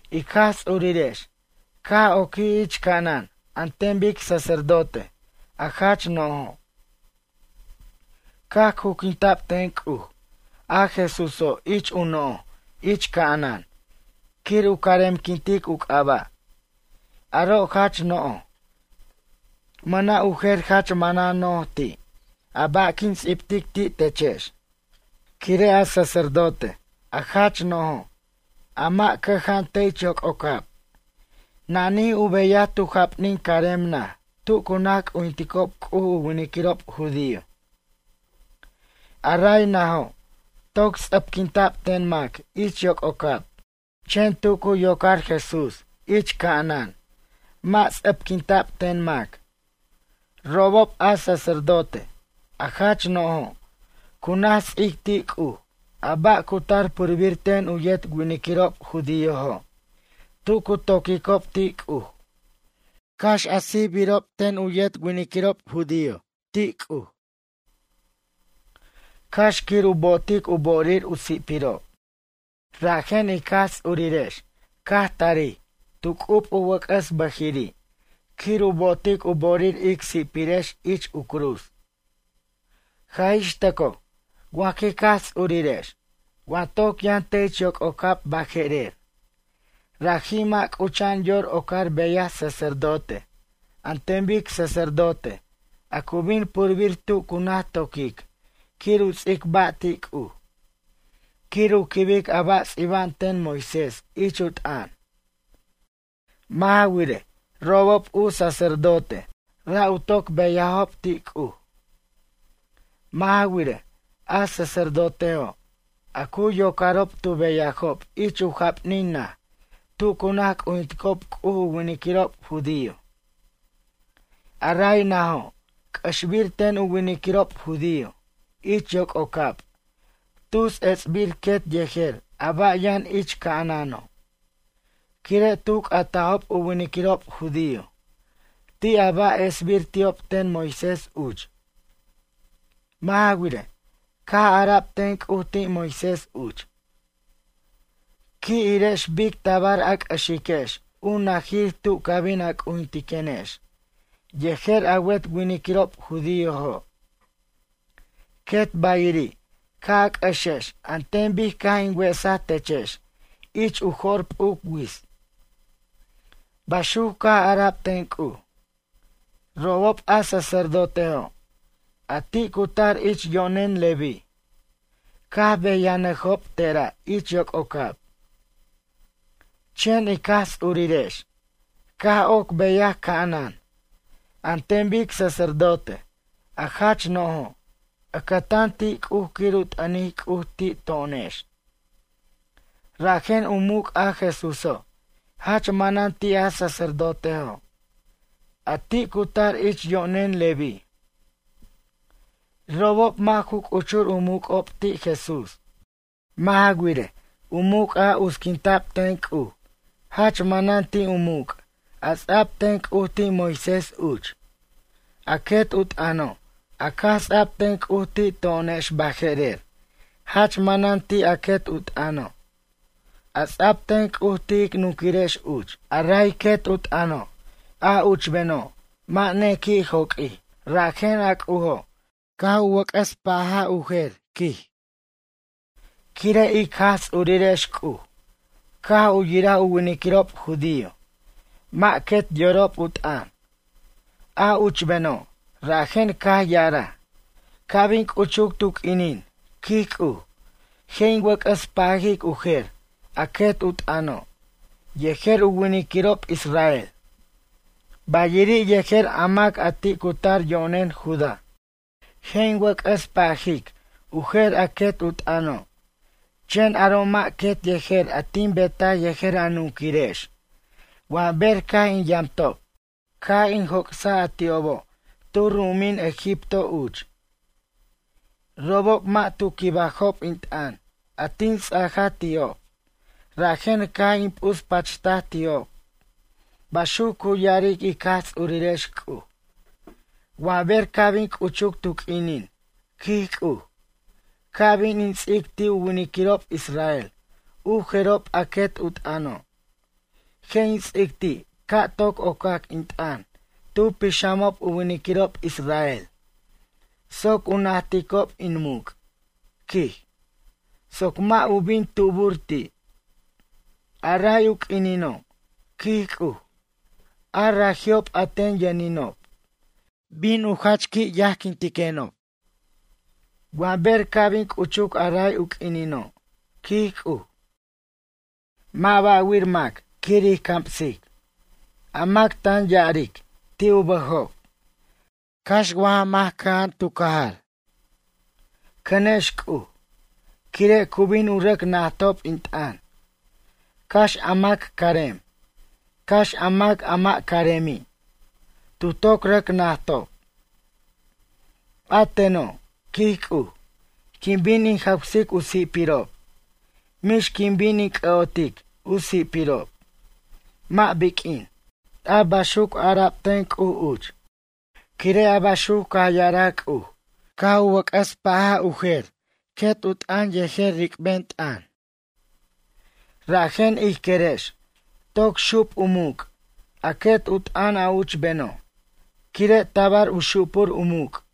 Ic Jaj Ts'urirex caj oquij ich ca'anan an ten bic sacerdote a jach no'jo'. Caj cuquinta'b ten C'uj a Jesúso' ich u noj ich ca'anan quir u caremquintic u c'aba'. Aro' jach no'j, mʌna' u jer jach manan no'j ti' a ba' quin ts'ibtic ti' techex. Quire' a sacerdote, a jach no'jo', a mac cʌja'an te' ich yoc'ocab, nanij u beyaj tu japnin carem naj tu cu naj c'ujinticob C'uj u winiquirob judío. A ray najo' toc ts'ʌpquinta'b ten mac ich yoc'ocab. Chen tu cu yocar Jesús ich ca'anan mʌ' ts'ʌpquinta'b ten mac. Robob a sacerdote, a jach no'jo', cu naj ts'ic ti' C'uj a ba' cu tar purbir ten u yet winiquirob judíojo' tu cu to'quicob ti' C'uj. Cax a sijbarob ten u yet winiquirob judío ti' C'uj, cax quir u bo'otic u bo'orir u si'pirob. Rajen ic Jaj Ts'urirex caj tarij tu c'ub u wʌc'ʌs bʌjiri' quir u bo'otic u bo'orir ic si'pirex ich u cruz. Jaj ix tʌcoj wa jic Jaj Ts'irirex wa toc yʌn te' ich yoc'ocab baje'rer, raji' mʌ' c'ucha'an yor ocar beyaj sacerdote an ten bic sacerdote a cu bin purbir tu cu naj to'quic quir u ts'ic ba' ti' C'uj, quir u quibic a ba' ts'iba'an ten Moisés ich u t'ʌn. Mʌ' ja wirej, robob u sacerdote ra' u toc beyajob ti' C'uj. Mʌ' ja wirej, a sacerdotejo', a cu yocarob tu beyajob ich u japnin naj tu cu naj c'ujinticob C'uj u winiquirob judío. A ray najo', c'ʌxbir ten u winiquirob judío ich yoc'ocab tus ets'bir quet yejer a ba' yʌn ich ca'anano', quire' tu ca'tajob u winiquirob judío ti' a ba' esbir ti'ob ten Moisés uch. Mʌ' ja wirej, caj ara'b ten C'uj ti' Moisés uch: “Qui' irex bic tabar a c'ʌxiquex u najir tu ca bin a c'ujintiquenex yejer a wet winiquirob judíojo'. Quet bayiri' ca' a c'ʌxex an ten bic caj in wesaj techex ich u jo'r p'uc wits.” Baxuc caj ara'b ten C'uj. Robob a sacerdotejo', a ti' cu tar ich yo'nen Leví, caj beyanʌjob tera' ich yoc'ocab. Chen ic Jaj Ts'urirex caj oc beyaj ca'anan an ten bic sacerdote a jach no'jo' ʌcʌtan ti' C'uj quir u t'ʌnic C'uj ti' to'onex. Rajen u muc' a Jesúso' jach manan ti' a sacerdotejo', a ti' cu tar ich yo'nen Leví. Robob mʌ' ju c'uchur u muc'ob ti' Jesús. Mʌ' ja wirej, u muc' a utsquinta'b ten C'uj, jach manan ti' u muc' a ts'a'b ten C'uj ti' Moisés uch. A quet u t'ʌno' a caj ts'a'b ten C'uj ti' to'onex baje'rer jach manan ti' a quet u t'ʌno', a ts'a'b ten C'uj ti' ic nunquirex uch. A ray quet u t'ʌno', a uchbeno' mʌ' nequi' joq'uij rajen a C'ujo' caj u wʌc'ʌs pa'aj u jer, quij. Quire' ic Jaj Ts'urirex C'uj caj u yiraj u winiquirob judío mʌ' quet yorob u t'ʌn, a uchbeno' rajen caj ya'araj: Ca' bin c'uchuc tu q'uinin, quij C'uj, je' in wʌc'ʌs pajic u jer a quet u t'ʌno' yejer u winiquirob israel, bayiri' yejer a mac a ti' cu tar yo'nen Judá. Je' in wʌc'ʌs pajic u jer a quet u t'ʌno' chen aro' mʌ' quet yejer a tin betaj yejer a nunquirex wa ber caj in yamtob, caj in joc'saj a ti'obo' tu ru'umin Egipto uch. Robob mʌ' tu quibajob in t'ʌn a tin ts'aja ti'ob rajen caj in p'uspachtaj ti'ob, baxuc cu ya'aric ic Jaj Ts'urirex C'uj. Wa ber ca' bin c'uchuc tu q'uinin, quij C'uj, ca' bin in ts'ic ti' u winiquirob israel u jerob a quet u t'ʌno', je' in ts'ic ti' ca' toc ocac in t'ʌn tu pixamob u winiquirob israel soc u najticob in muc', quij soc mʌ' u bin tubur ti'. A ray u quinino', quij C'uj, a raji'ob a ten yʌninob, jach qui' bin u yajquintiquenob. Wa ber ca' bin c'uchuc a ray u q'uinino', quij C'uj, mʌ' ba'wir mac quir ij camsic. A mac tan ya'aric ti' u bʌjob, cax wa ja mac cʌja'an tu cajar: “Cʌnex C'uj”, quire' cu bin u rʌc najtob in t'ʌn, cax a mac carem, cax a mac a mʌ' caremi', tu toc rʌc najtob. A teno', quij C'uj, quin bin in jawsic u si'pirob, mix quin bin in c'ʌ'otic u si'pirob, mʌ' biq'uin. A baxuc ara'b ten C'uj uch. Quire' a baxuc caj ya'araj C'uj caj u wʌc'ʌs pa'aj u jer quet u t'ʌn yejer ric'ben t'ʌn. Rajen ij querex toc xup u muc' a quet u t'ʌn a uchbeno' quire' tabar u xupur u muc'.